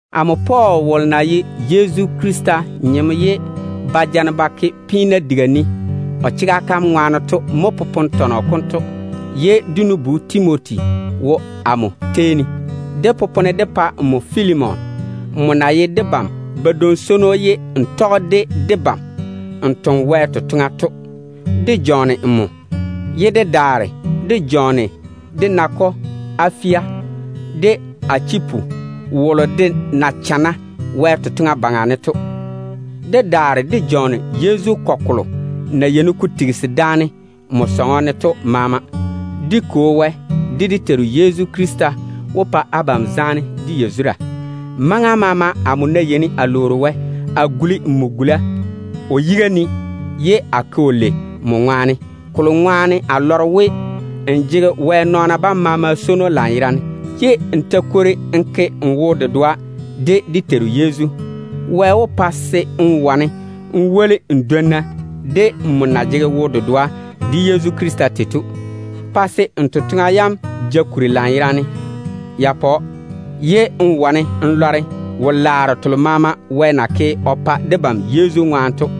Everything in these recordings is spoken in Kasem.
Amo Pɔɔl wolo na ye Yezu Krista nyem ye ba ja-ne ba ke peena diga ne o chega kam ŋwaane to mo popone tɔnɔ konto, ye dé nu-bu Timoti wo amo tei ne. Dé popone dé pa nmo Filimon, nmo na ye debam badwoŋ-swono ye n tɔge de debam n toŋe Wɛ totoŋa to. Dé jɔɔne nmo, ye dé daare dé jɔɔne dé nakɔ Afia, de Achipu wolo de na chana Wɛ totoŋa baŋa ne to. Dé daare dé jɔɔne Yezu kɔgɔ kolo na yeini ko tigisi daane nmo sɔŋɔ ne to maama. Dé Kwo Wɛ, de dé Teiru Yezu Krista wó pa abam zaane de yazura. Maŋa maama amo ná yeini a lwoori Wɛ, a guli nmo gula o yiga ne ye a ke‑o lei nmo ŋwaane. Kolo ŋwaane a lɔre we, n jege Wɛ nɔɔna bam maama swono lanyerane, ye n ta kwori n ke n wo-dedoa de dé Teiru Yezu. Wɛ wó pa‑m chwoŋa se n wane n woli n dwonna de nmo na jege wo-dedoa de Yezu Krista tei to, pa se n totoŋa yam ja kuri lanyerane, ye n wane n lɔre wo-laaro telo maama Wɛ na ke o pa debam Yezu ŋwaane to.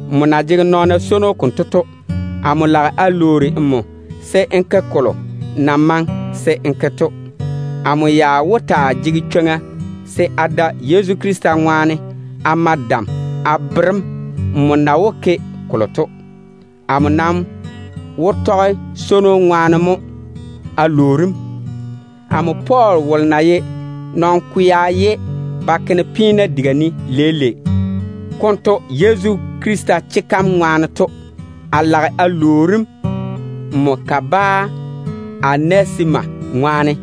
Mo kokuri, amo lage a lwoori nmo se n ke kolo na maŋe se n ke to. Amo ya wó taa jege chwoŋa se a da Yezu Krista ŋwaane a ma dam a bere‑m nmo na wó ke kolo to. Amo nam wó tɔge swono ŋwaane mo a lwoori‑m. Amo Pɔɔl wolo na ye nɔn-kwea ye ba ke-ne peena diga ne leile konto Yezu Krista chega kam ŋwaane to, a lage a lwoori‑m nmo kabaa Onesima ŋwaane.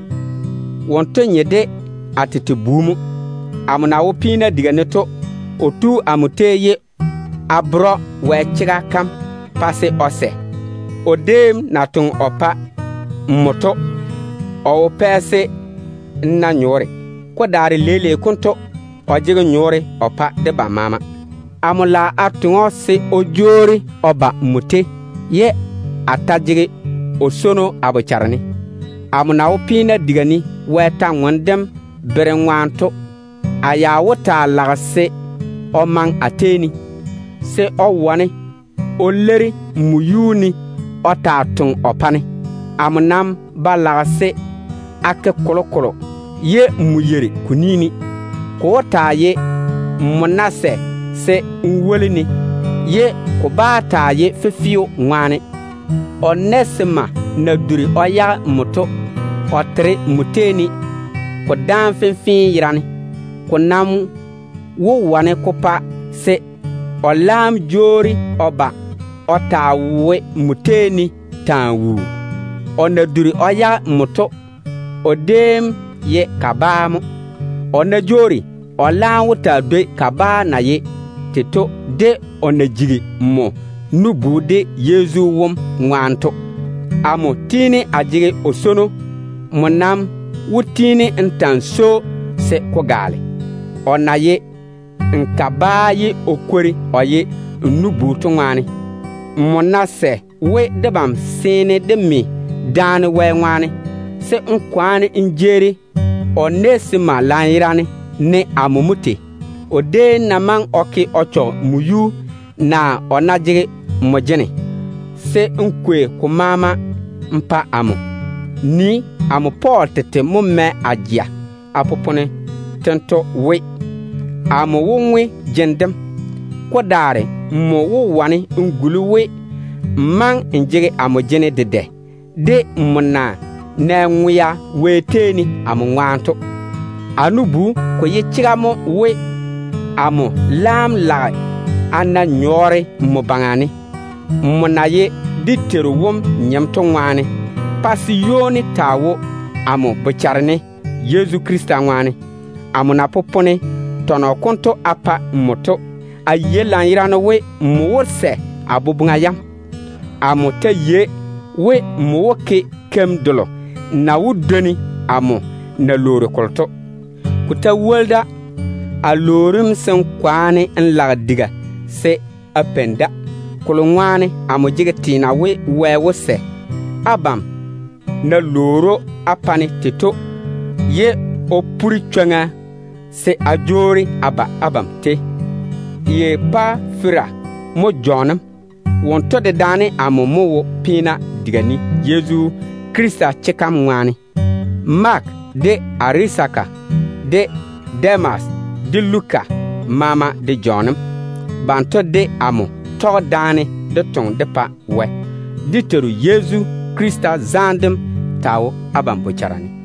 Wonto nye de a tete bu mo. Amo na wo peena diga ne to mo a jigi o kwo Wɛ chwoŋa seeni. O déem na toŋe o pa nmo to, o wo pɛ se n na nyɔɔre. Ko daare leile konto o jege nyɔɔre o pa nmo de amo maama. Amo lage a toŋe‑o se o jwoori o ba nmo tei, ye a ta jege o swono a bochare ne. Amo na wo peena diga ne Wɛ kwor-ywoŋa kam berem ŋwaane to, a ya wó taa lage se o maŋe a tei ne, se o wane o leiri nmo yuu ne o taa toŋa o pa-ne. Amo nam ba lage se a ke kolokolo ye nmo yeiri ko ni ne. Ko wó taa ye nmo ná sɛ se n woli-ne, ye ko bá taa ye fefeo ŋwaane. Onesima na duri o yage nmo to, o pɔɔre nmo tei ne maŋa fenfee wone. Ko nam wó wane ko pa se o laam jwoori o ba o taa wo nmo tei ne taa wuu. O na duri o yage nmo to, o déem ye kabaa mo. O ná jwoori, o laam wó taa dwoi kabaa na ye tei to, de o na jigi nmo nu-bu dé Teiru wom ŋwaane to. Amo tiini a jege o swono. Nmo nam wó tiini n ta‑n swoi‑o se ko gaale, o na ye n kabaa ye o kwori o ye n nu-bu to ŋwaane. Nmo ná sɛ we debam seene dé me daane Wɛ ŋwaane, se n kwaane n jeeri Onesima lanyerane ne amo mo tei. O déem ná maŋe o ke o chɔge nmo yuu, naa o ná jege nmo jene, se n kwei ko maama n pa amo. Nii, amo Pɔɔl tete mo mɛ a jeŋa a popone tento we, Amo wó ŋwe jene dem. Ko daare nmo wó wane n guli we, n maŋe n jege amo jene dedɛ, de nmo na nɛ ŋwea Wɛ tei ne amo ŋwaane to. A nu-bu, ko ye chega mo we, amo laam lage se a na nyɔɔre nmo baŋa ne, nmo na ye dé Teiru wom nyem to ŋwaane. Pa se ywoni taa wo amo bochare ne Yezu Krista ŋwaane. Amo na popone tɔnɔ konto a pa nmo to, a yei lanyerane we, nmo wó sɛ a boboŋa yam. Amo ta yei we, nmo wó ke keim delo na wó dwoni amo na lwoori kolo to. Ko ta woli da, a lwoori‑m se n kwaane n lage diga se a peini da. Kolo ŋwaane amo jege teena we, Wɛ wó sɛ abam na lwoori‑o á pa-ne tei to ye o pore chwoŋa se a jwoori a ba abam tei. Epafera mo jɔɔne‑m. Wonto dedaane amo mo wo peena diga ne Yezu Krista chega kam ŋwaane. Maake, de Arisaka, de Demas, de Luka maama de jɔɔne‑m. Banto de amo tɔge daane dé toŋa dé pa Wɛ. Dé Teiru Yezu Krista zaane dem taa wo abam bochara ne.